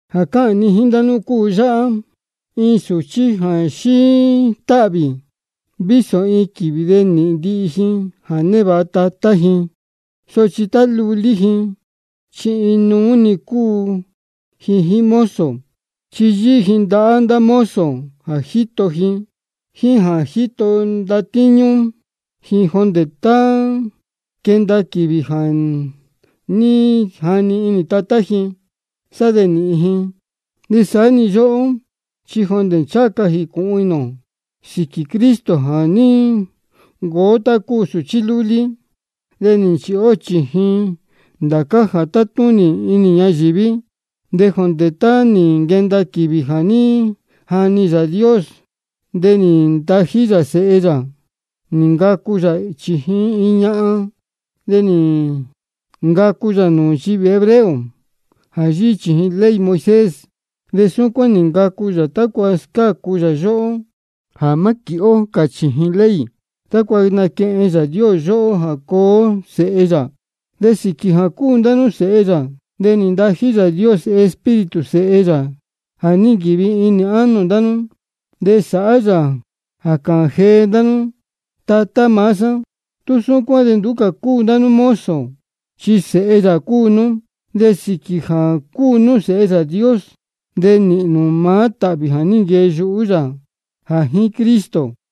Jā cáhān ni jíín ndá nú cúu yáhá: Iin sūchí jā xíí táhvī, vísō iin quīvī de nīhīn ndihi ji jā névāha tatá ji, sochi tá lulí ji chi inuú-ni cúu ji jíín mozo. Chi yíhí ji ndahá ndá mozo jā jíto ji jíín jā jíto ndatíñú ji, jondē tá quenda quīvī jā ní jani tatá ji, sá de nīhīn ji. De saá-ni yóhó, chi jondē ncháha ca jīcūhun inī ō sīquī Cristo de nī ncuu ó tá cúu sūchí lúlí, de nī nchīhi ó chījin ndācá jā tátúnī inī ñayīví. De jondē tá nī nquenda quīvī jā ní jani Yāā Dios, de nī ntají yā Sēhe yā, nī ncacu yā chījin iin ñahan, de nī ncacu yā nūū nchivī hebreo jā yíhí chījin ley Moisés. Súcuán nī ncacu yā tácua scácu yā yóhó jā má quīhi ó cā chījin ley, de tácua naquehen Yāā Dios yóhó jā cuu ó sēhe yā. De sīquī jā cúu ndá nú sēhe yā, de nī ntají Yāā Dios Espíritu Sēhe yā jā ní nquīvi inī ánō ndá nú, de sáhá yā jā cáhān jee ndá nú: Tatá maá sá. Tú súcuán de nduú cā cúu ndá nú tá cúu mozo, chi sēhe yā cúu nú. De sīquī jā cúu nú sēhe Yāā Dios, de nīhīn nū maá tāhvī jā ní nquee yuhú yā jā jíín Cristo.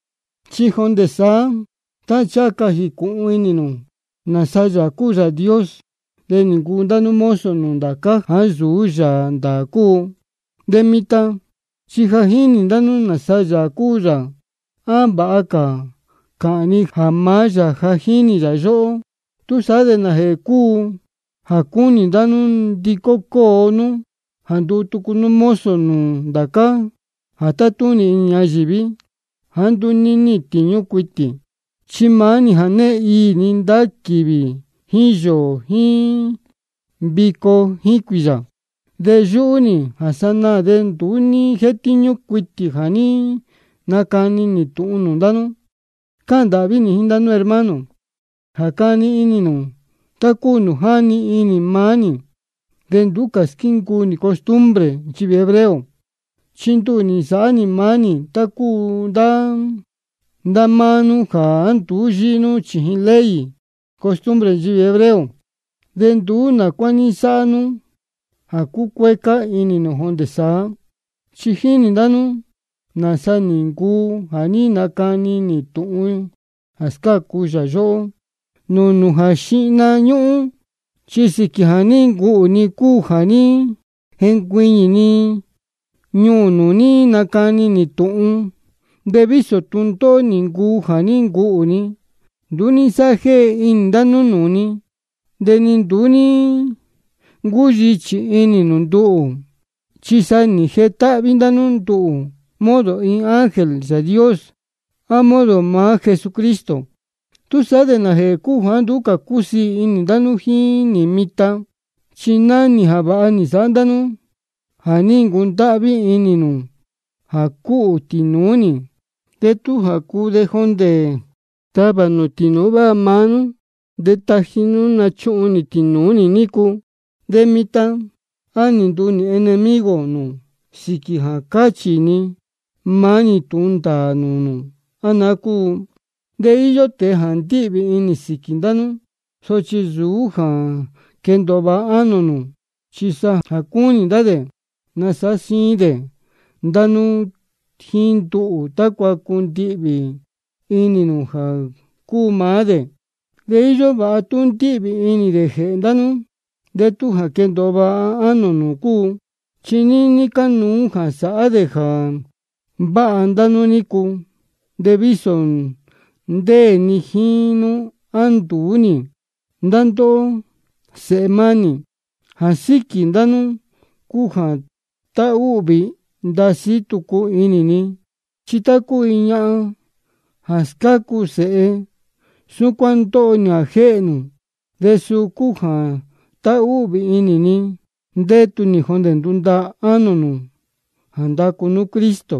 Chi jondē saá, jondē tá ncháha ca jīcūhun inī nū nāsa Yāā cúu Yāā Dios, de nī ncuu ndá nú mozo nūū ndācá jāá nsūú yāā ndāā cúu. De mitan chi ja jínī ndá nú nāsa Yāā cúu yā, á vāha cā cāhān ni jā maá yā ja jínī yā ndóhó. ¿Túsaá de nājēhē cúu jā cúnī ndá nú nandicó cóo nú jā nduu tucu nú mozo nūū ndācá jā tátúnī inī ñayīví jāá nduú níhīn tīñú cuitī? Chi maá-ni jā née iī ndá nú quīvī jíín yōō jíín vico jíín cuīyā. De yúhú nī jā sanaā de nduú ní jétíñú cuitī jā ní nacani nī tūhun nūū ndá nú. Cáhān ndāhví nī jíín ndá nú hermano, jā cani inī nū tá cúu nūū jáni inī maá nī jā nduú cā squíncuu nī costumbre nchivī hebreo. Chi nduhū nī nasāhá nī maá nī tá cúu ndá máá nú jāá nduú yíhí nú nūū ley costumbre nchivī hebreo. De nduú nā cuá ní nsáhá nú jā cucuécá inī ni jondē saá. Chi jínī ndá nú nāsa nī ncuu jā ní nacani nī tūhun jā scácu yā yóhó nūū nū jā xíhna ñúhún, chi sīquī jā ní ncuhū ni cúu jā ní jencuiñī ni ñuū nū nī nacani nī tūhun. De vísō tūndóhó nī ncuu jā ní ncuhū ni, de nduú ní nsáhá jéhe inī ndá nú nūū ni, de ni nduú ní ncúyichī inī nū nduhū. Chi sa nī jetáhví ndá nú nduhū modo iin ángel Yāā Dios, á modo maá Jesucristo. ¿Túsaá de nājēhē cúu jāá nduú cā cúsiī inī ndá nú jíín nī mitan? Chi náhán nī jā vāha nī nsāhá ndá nú jā ní ntahúhvī inī nū jā cúhū tīnūú nī, de tú jā cuu de jondē tavā nū tīnūú váha maá nú de taji nú nūcūhun tīnūú nī nícu. De mitan ¿de á nī nduu nī enemigo nū sīquī jā cáchī ni maá-ni tūhun ndāā nūū nū, á naá cúu? De íyó tēe jā ndíhvī inī sīquī ndá nú, sochi nsūú jā quendōo vāha ánō nū, chi sa jā cúnī ndá dē nasāhá síín dē ndá nú jíín nduhū, tácua cundihvī inī nū jā cúu maá dē. De íyó vāha tú ndíhvī inī dē jēhē ndá nú, de tú jā quendōo vāha ánō nū cúu. Chi níní cánuú jā sāhá dē jā váha ndá nú nícu, vísō ndéē ni jíín nú á nduú nī. Ndá ndóhó sēhe mánī, jā síquī ndá nú cúu jā táhúhvī ndasí tucu inī ni, chi tá cúu iin ñahan jā scácu sēhe, súcuán ndóho nī jā jéhē nū. De suu cúu jā táhúhvī inī ni ndétu nī jondē ná ndúndaā ánō nū jā ndacu nú Cristo.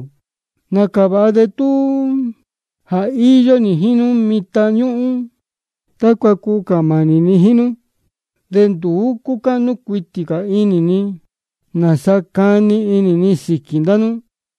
Nācā jā váha de tú jā íyó nī jíín nú mitan ñúhún, tácua cuu cāhān mānī ni jíín nú. De nduú cúcáhnú cuitī cā inī ni nāsa cani inī ni sīquī ndá nú.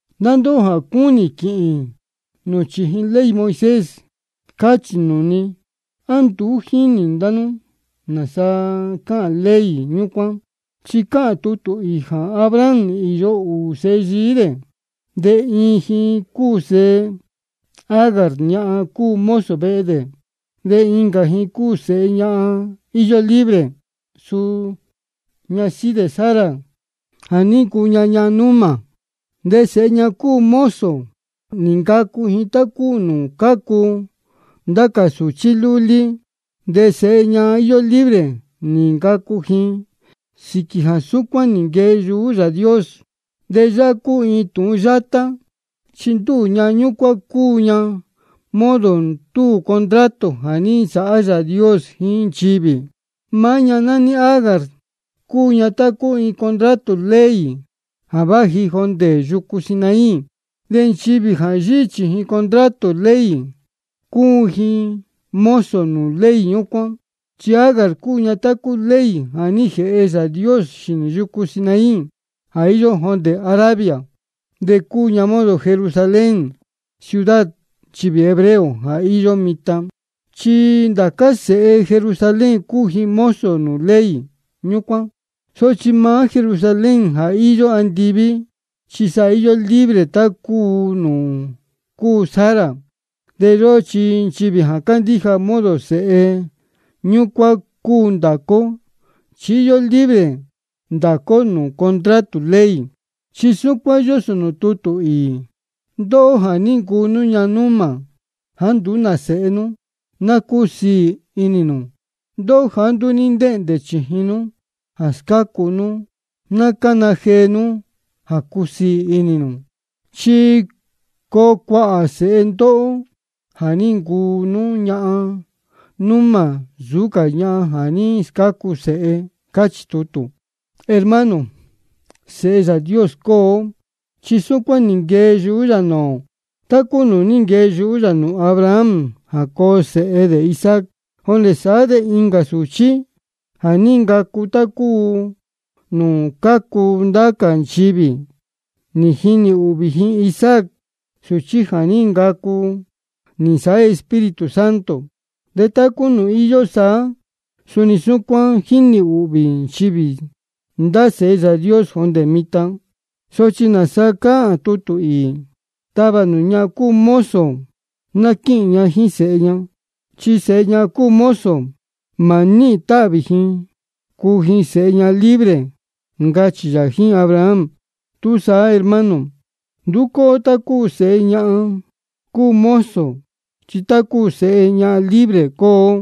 Ndá ndóhó jā cúnī nū quihi nú chījin ley Moisés, cachī nūū ni: ¿A nduú ní jíni ndá nú nāsa cáhān ley ñúcuán? Chi cáhān tutū īī jā Abraham nī īyo ūū sēhe yií dē. De iin ji cúu sēhe Agar, ñahan cúu mozo vehe dē. De incā ji cúu sēhe ñahan íyó libre, suu ñasíhí dē Sara jā ní ncuu ña ñahan númā. De sēhe ñahan cúu mozo, nī ncacu ji tá cúu nūū cácu ndá cā sūchí lúlí. De sēhe ñahan íyó libre, nī ncacu ji sīquī jā súcuán nī nquee yuhú Yāā Dios. De yáhá cúu iin tūhun yátá, chi ndúū ñahan ñúcuán cúu ña modo ndúū contrato jā ní nsāhá Yāā Dios jíín nchivī. Maá ñahan nání Agar, cúu ña tá cúu contrato ley jā váji jondē yucu Sinaí. De nchivī jā yíhí chījin contrato ley, cúu ji mozo nūū ley ñúcuán. Chi Agar cúu tá cúu ley jā ní jēhe Yāā Dios xīnī yucu Sinaí jā íyó jondē Arabia. De cúu ña modo Jerusalén, ciudad nchivī hebreo, jā íyó mitan, chi ndācá sēhe Jerusalén cúu ji mozo nūū ley ñúcuán. Sochi maá Jerusalén jā íyó andiví, chi sa íyó libre tá cúu nūū cúu Sara. De yóhó nchivī jā cándíja, modo sēhe ñúcuán cúu ndācá ó, chi íyó libre ndācá ó nūū contrato ley. Chi súcuán yósō nūū tutū īī: Ndóhó jā ní ncuu nú ñahan númā jāá nduú sēhe nú, ná cúsiī inī nū. Ndóhó jāá nduú ní ntéhndē chījin nú jā scácu nú, ná cána jee nú jā cúsiī inī nū. Chi coo cuāhā cā sēhe ndóhó jā ní ncuu nú ñahan númā nsūú cā ñahan jā ní scácu sēhe. Cáchī tutū. Hermano, sēhe Yāā Dios cúu ó, chi súcuán nī nquee yuhú yā nūū ō, tá cúu nūū ní nquee yuhú yā nūū Abraham jā coo sēhe dē Isaac. De jondē saá de incā sūchí jā ní ncacu tá cúu nūū cácu ndá cā nchivī, nī jinī ūhvī ji Isaac, sūchí jā ní ncacu nī nsāhá Espíritu Santo. De tá cúu nūū ní īyo saá, suni súcuán jínī ūhvī nchivī ndá sēhe Yāā Dios jondē mitan. ¿Sochi nāsa cáhān tutū īī? Tavā nū ñahan cúu mozo ná quíhīn ña jíín sēhe ña. Chi sēhe ñahan cúu mozo, mā níhīn ji tāhvī ji nūū sēhe ñahan libre, ncachī yā jíín Abraham. Túsaá, hermano, nduú cúu ó tá cúu sēhe ñahan cúu mozo, chi tá cúu sēhe ñahan libre cúu ó.